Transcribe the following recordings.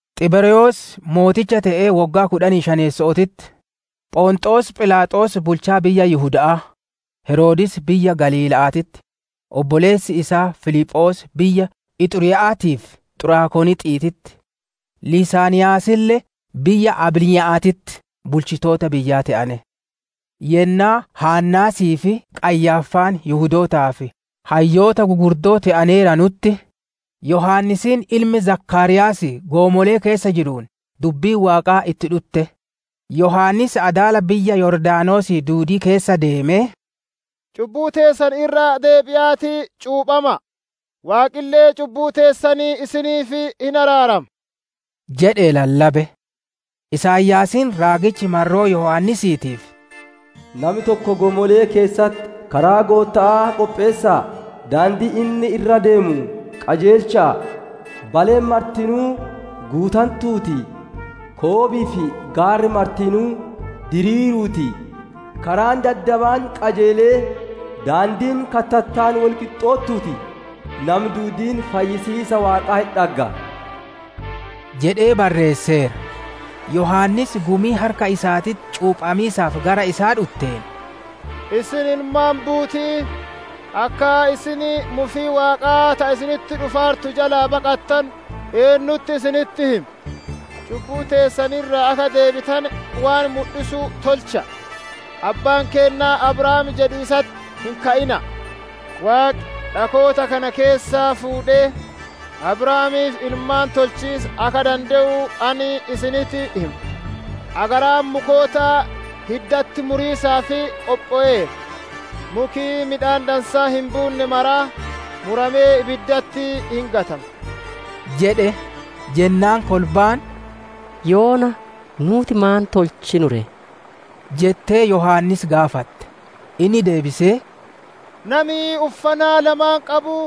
Xiberyoos mooticha te'ee woggaa kudhanii shaneesso'ootitti, Phonxoos Philaaxoos bulchaa biyya Yihuda'aa, Heroodis biyya Galiila'aatitti, obboleessi isaa Filiphoos biyya Ixuriya'aatii fi Xuraakonixiititti, Lisaaniyaasille biyya Abiliinya'aatitti bulchitoota biyyaa te'ane. Yennaa Haannaasii fi Qayyaaffaan Yihudootaaf hayyoota gugurdoo te'aneeranutti, Yohaannisiin ilmi Zakaariyaasii goomolee keessa jiruun dubbiin Waaqaa itti dhutte. Yohaannis adaala biyya Yordaanosii duudii keessa ideemee, «Cubbuu teessan irraa deebi'aatii cuuphama'a; Waaqille cubbuu teessan isiniif hin araarama» jedhee lallabe. Isaayaasiin raagichi marroo Yohaannisiitiif, «Nami tokko goomolee keessatti, ‹Karaa Gootta'aa qopheessa'a; daandii inni irra ideemu qajeelcha'a! «‹Baleen martinuu guutantuu ti, koobii fi gaarri martinuu diriiruu ti. Karaan daddabaan qajeelee, daandiin kattattaan wol qixxoottuu ti. Nami duudiin fayyisiisa Waaqaa hin dhagga›» jedhee barreesseera. Yohaannis gumii harka isaatitti cuuphamiisaaf gara isaa dhutteen, «Isin ilmaan buuti'ii! Akka isin mufii Waaqaa ta isinitti dhufaartu jalaa baqattanu eennutti isinitti hime? Cubbuu teessan irraa akka deebitane waan mudhisu tolcha'a. Abbaan keenna Abrahaam jedhiisatti hin ka'ina'a. Waaqi dhakoota kana keessaa fuudhee Abrahaamiif ilmaan tolchiisa akka dande'u ani isinitti hima. Agaraan mukoota hiddatti muriisaaf qophoweera. Muki midhaan dansaa hin buunne maraa muramee ibiddatti hin gatama» jedhe. Jennaan kolbaan, «Yoona nuuti maan tolchinu ree?» jettee Yohaannis gaafatte Inni deebisee, «Nami uffana lamaan qabu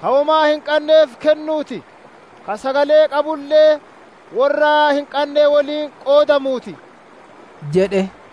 ka womaa hin qanneef kennuu ti; ka sagalee qabulle worra hin qanne woliin qoodamuu ti» jedhe.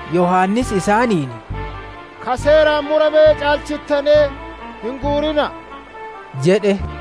Yohaannis isaaniin, «Ka seeraan murame caalchittanee hin guurina'a» jedhe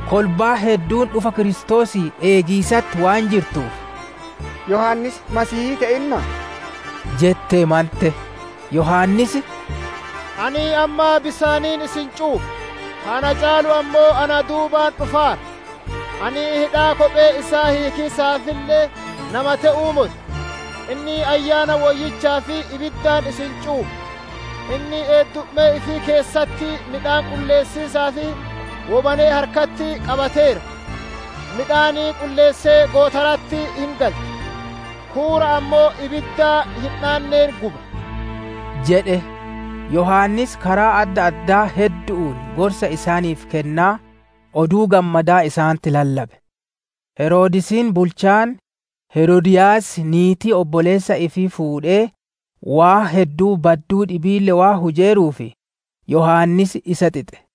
Kolbaan hedduun dhufa Kiristoosii eegiisatti waan jirtuuf, «Yohaannis Masiihii te'innaa?» jettee mante. Yohaannis, «Ani amma bisaaniin isin cuupha, ka na caalu ammoo na duubaan dhufaara. Ani hidhaa kophee isaa hiikiisaafille nama te'uu moti. Inni Ayyaana Woyyichaa fi ibiddaan isin cuupha. Inni eeddummee ifii keessatti midhaan qulleessiisaaf wobanee harkatti qabateera; midhaan qulleessee gootara'atti hin galcha; huura ammoo ibidda hin dhaanneen guba» jedhe. Yohaannis karaa adda addaa heddu'uun gorsa isaaniif kennaa, Oduu Gammadaa isaanitti lallabe. Heroodisiin bulchaan, Heroodiyaas niitii obboleessa ifii fuudhee, waan badduu hedduu dhibiille waan hujeeruuf Yohaannis isa xixe.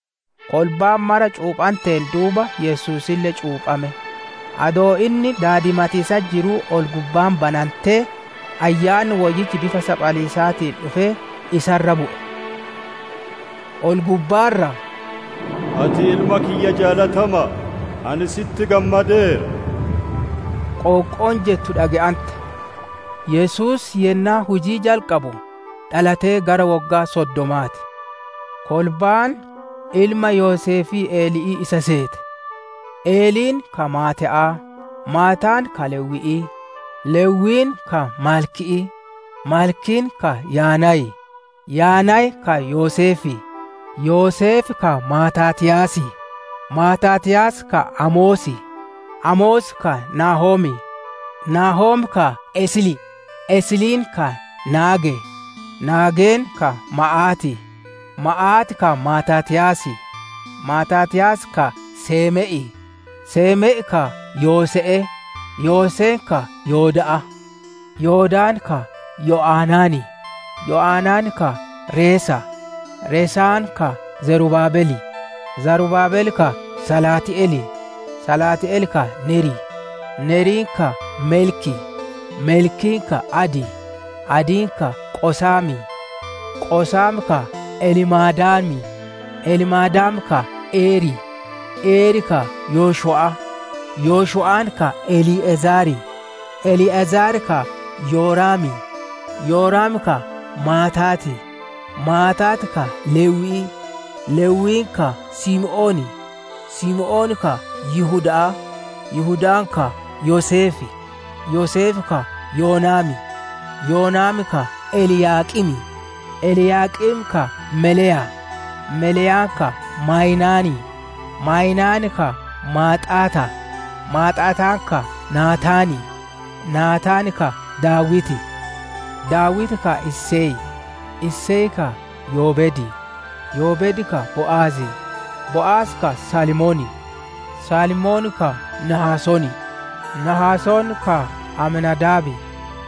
Kolbaan mara cuuphanteen duuba Yesuusille cuuphame. Adoo inni daadimatiisatti jiruu ol-gubbaan banantee, Ayyaanni Woyyichi saphaliisa fakkaatee dhufee isa irra bu'e. Ol-gubbaa irraa, «Ati Ilma kiyya jaalatama'a. Ani si'itti gammadeera» qoonqoon jettu dhage'ante. Yesuus yennaa hujii jalqabu, dhalatee gara woggaa soddomaa ti. Kolbaan, ilma Yoseefii Eli'ii isa seete. Eliin ka Maataa'aa, Maataan ka Lewwi'ii, Lewwiin ka Malki'ii, Malkiin ka Yaanaayii, Yaanaayii ka Yoseefii, Yoseef ka Maataatiyaasii, Maataatiyaas ka Amosii, Amos ka Naahomii, Naahom ka Eslii, Esliin ka Naagee, Naageen ka Maa'aatii, Maa'aat ka Maataatiyaasii, Maataatiyaas ka Seeme'ii, Seeme'i ka Yoose'ee, Yooseen ka Yooda'aa, Yoodaan ka Yo'anaanii, Yo'anaan ka Resaa, Resaan ka Zarubaabelii, Zarubaabel ka Salaati'elii, Salaati'el ka Neerii Neeri ka Melkii, Melkiin ka Adii, Adiin ka Qosaamii, Qosaam ka Elmaadaamii, Elmaadaam ka Eerii, Eer ka Yoshu'aa, Yoshu'aan ka Elii'ezaarii, Elii'ezaar ka Yoraamii, Yoraam ka Maataatii, Maataat ka Lewwii, Lewwiin ka Simi'oonii, Simi'oon ka Yihuda'aa, Yihudaan ka Yoseefii, Yoseef ka Yoonaamii, Yoonaam ka Eliyaaqimii, Eliyaaqim ka Meleyaa, Meleyaan ka Maayinaanii, Maayinaan ka Maaxaataa, Maaxaataan ka Naataanii, Naataan ka Daawitii, Daawiti ka Iseyii, Isey ka Yoobeedii, Yoobeed ka Bo'azii, Bo'az ka Salmoonii, Salmoon ka Nahasoonii, Nahasoon ka Aminaadaabii,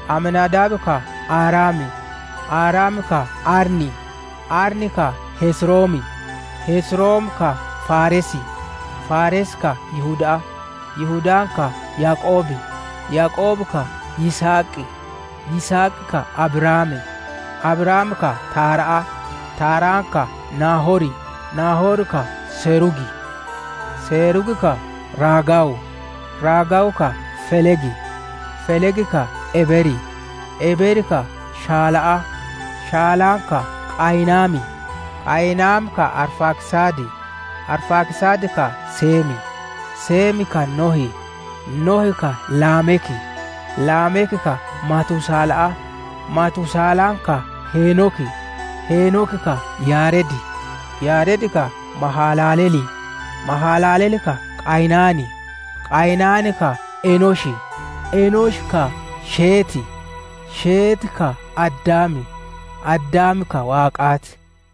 Aminaadaab ka Aaramii, Aaram ka Arnii, Arni ka Hesromii, Hesrom ka Faaresii, Faares ka Yihuda'aa, Yihudaan ka Yaaqoobii, Yaaqoob ka Yisihaqii, Yisihaq ka Abrahaamii, Abrahaam ka Taara'aa, Taaraan ka Naahorii, Naahor ka Seruugii, Seruug ka Raagaawuu, Raagaawu ka Felegii, Feleg ka Ebeerii, Ebeer ka Shala'aa, Shalaan ka Qayinaanii, Qayinaan ka Arfaaksaadii, Arfaaksaad ka Seemii, Seem ka Nohii, Nohi ka Laamekii, Laamek ka Matusaala'aa, Matusaalaan ka Heenokii, Heenoki ka Yaaredii, Yaared ka Mahalalelii, Mahalalel ka Qayinaanii, Qayinaan ka Enoshii, Enoshi ka Sheetii, Sheeti ka Addaamii, Addaam ka Waaqaa ti.